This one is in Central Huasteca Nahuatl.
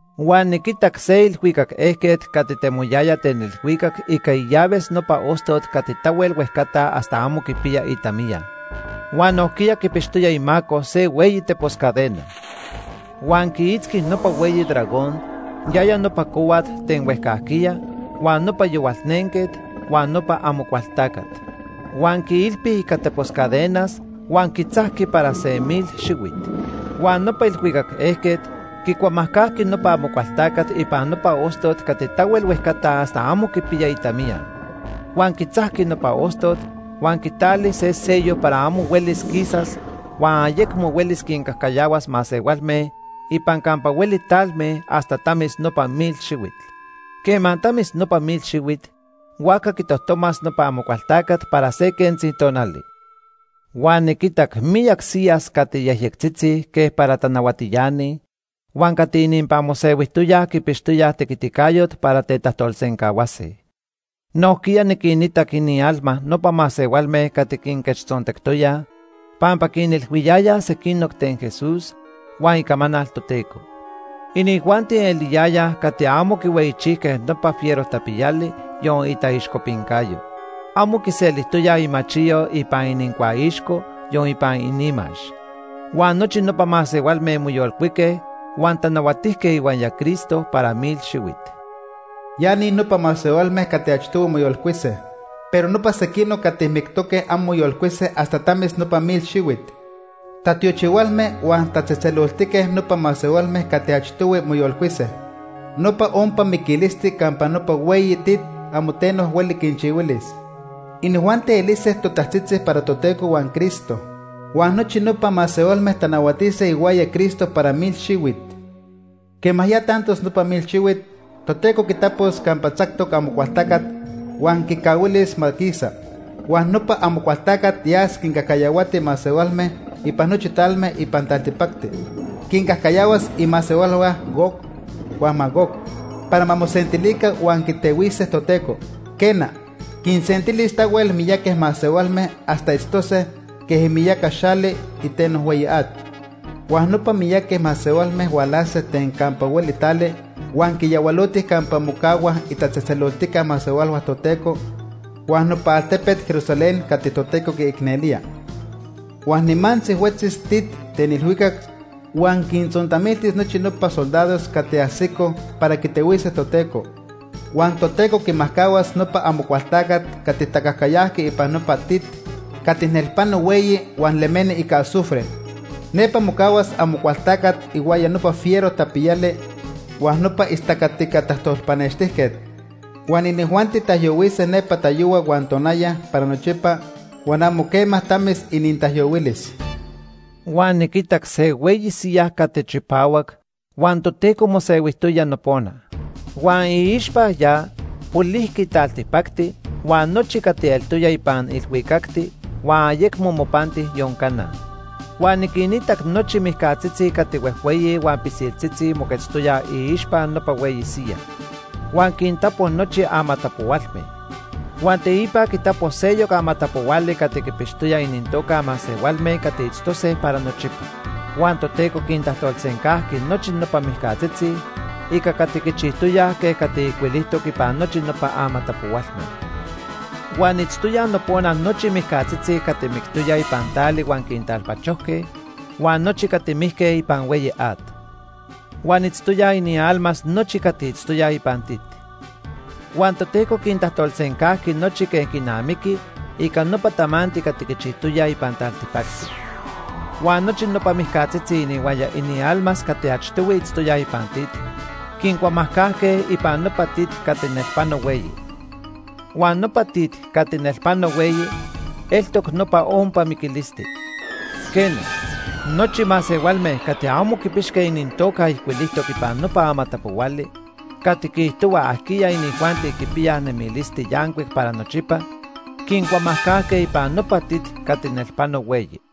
Huan niquitac se ilhuicac ejquet cati temoyaya ten ilhuicac ica illaves nopa ostot cati tahuel huejcata hasta amo quipiya itamiya. Huan nojquiya quipixtoya imaco se hueyi tepos cadena. Huan quiitzqui nopa hueyi dragón, yaya nopa cohuat ten huejcajquiya, huan nopa Yohualnenquet, huan nopa Amocualtacat. Huan quiilpi ica tepos cadenas huan quitzajqui para se mil xihuit. Huan nopa ilhuicac ejquet quicuamajcajqui nopa Amocualtacat ipan nopa ostot cati tahuel huejcata hasta amo quipiya itamiya. Huan quitzajqui nopa ostot huan quitali se sello para amo huelis quisas huan ayecmo huelis quincajcayahuas masehualme ipan campa hueli talme hasta tamis nopa mil xihuit. Quema tamis nopa mil xihuit, huajca quitojtomas nopa Amocualtacat para se quentzi tonali. Huan niquitac miyac siyas cati yejyectzitzi quej para tanahuatiani huan cati ininpan mosehuijtoyaj quipixtoyaj tequiticayot para tetajtolsencahuase. Nojquiya niquinitac inialma nopa masehualme cati quinquechtzontectoyaj pampa quinilhuiyayaj sequinoc ten Jesús huan icamanal Toteco. Inijuanti eliyayaj cati amo quihueyichijque nopa fiero tapiyali, yon itaixcopincayo. Amo quiselijtoyaj imachiyo ipan inincuaixco, yon ipan inimax. Huan nochi nopa masehualme moyolcuique huan tanahuatijque ihuaya Cristo para mil xihuit. Ya ni nopa masehualme cati achtohui moyolcuise. Pero nopa sequinoc cati mictoque amo moyolcuise hasta tamis nopa mil xihuit. Tatiochihualme huan tatzejtzeloltique nopa masehualme cati achtohui moyolcuise. Nopa ompa miquilisti campa nopa hueyi tit amo teno hueli quinchihuilis. Inijuanti elise totajtzitzi para Toteco huan Cristo. Huan nochi nopa masehualme tanahuatise ihuaya Cristo para mil xihuit. Quema ya tantos nopa mil xihuit, Toteco quitapos campa tzactoc Amocualtacat huan quicahuilis ma quisa. Huan nopa Amocualtacat yas quincajcayahuati masehualme ipan nochi talme ipan taltipacti. Quincajcayahuas imasehualhua Gog huan Magog para ma mosentilica huan quitehuise Toteco. Quena, quinsentilis tahuel miyaqui masehualme hasta itztose quej imiyaca xali iteno hueyi at. Huan nopa miyaqui masehualme hualase ten campa hueli tali huan quiyahualotij campa mocahuaj itatzejtzeloltica masehualhua Toteco huan nopa altepet Jerusalén cati Toteco quiicnelía. Huan nimantzi huetzis tit ten ilhuicac huan quintzontamiltis nochi nopa soldados cati ajsicoj para quitehuise Toteco. Huan Toteco quimajcahuas nopa Amocualtacat cati tacajcayajqui ipan nopa tit cati nelpano hueyi huan lemeni ica azufre. Nepa mocahuas Amocualtacat ihuaya nopa fiero tapiyali huan nopa istacatica tajtolpanextijquet. Huan inijuanti taijyohuise nepa tayohua huan tonaya para nochipa huan amo quema tamis inintaijyohuilis. Huan niquitac se hueyi siyaj cati chipahuac huan Toteco mosehuijtoya nopona. Huan iixpa ya polijqui taltipacti huan nochi cati eltoya ipan ilhuicacti huan ayecmo mopanti yon cana. Huan niquinitac nochi mijcatzitzi cati huejhueyi huan pisiltzitzi moquetztoyaj iixpa nopa hueyi siyaj. Huan quintapo nochi amatapohualme. Huan teipa quitapo seyoc amatapohuali cati quipixtoya inintoca masehualme cati itztose para nochipa. Huan Toteco quintajtolsencajqui nochi nopa mijcatzitzi ica cati quichijtoyaj quej cati ijcuilijtoc ipan nochi nopa amatapohualme. Huan itztoyaj nopona nochi mijcatzitzi cati mictoyaj ipan tali huan quintalpachojque huan nochi cati mijque ipan hueyi at. Huan itztoyaj inialmas nochi cati itztoyaj ipan tit. Huan Toteco quintajtolsencajqui nochi quej quinamiqui ica nopa tamanti cati quichijtoyaj ipan taltipacti. Huan nochi nopa mijcatzitzi inihuaya inialmas cati achtohui itztoyaj ipan tit, quincuamajcajque ipan nopa tit cati nelpano hueyi. Huan nopa tit cati nelpano hueyi eltoc nopa ompa miquilisti. Quena, nochi masehualme cati amo quipixque inintoca ijcuilijtoc ipan nopa amatapohuali cati quiijtohua ajquiya inijuanti quipiyaj nemilisti yancuic para nochipa quincuamajcajque ipan nopa tit cati nelpano hueyi.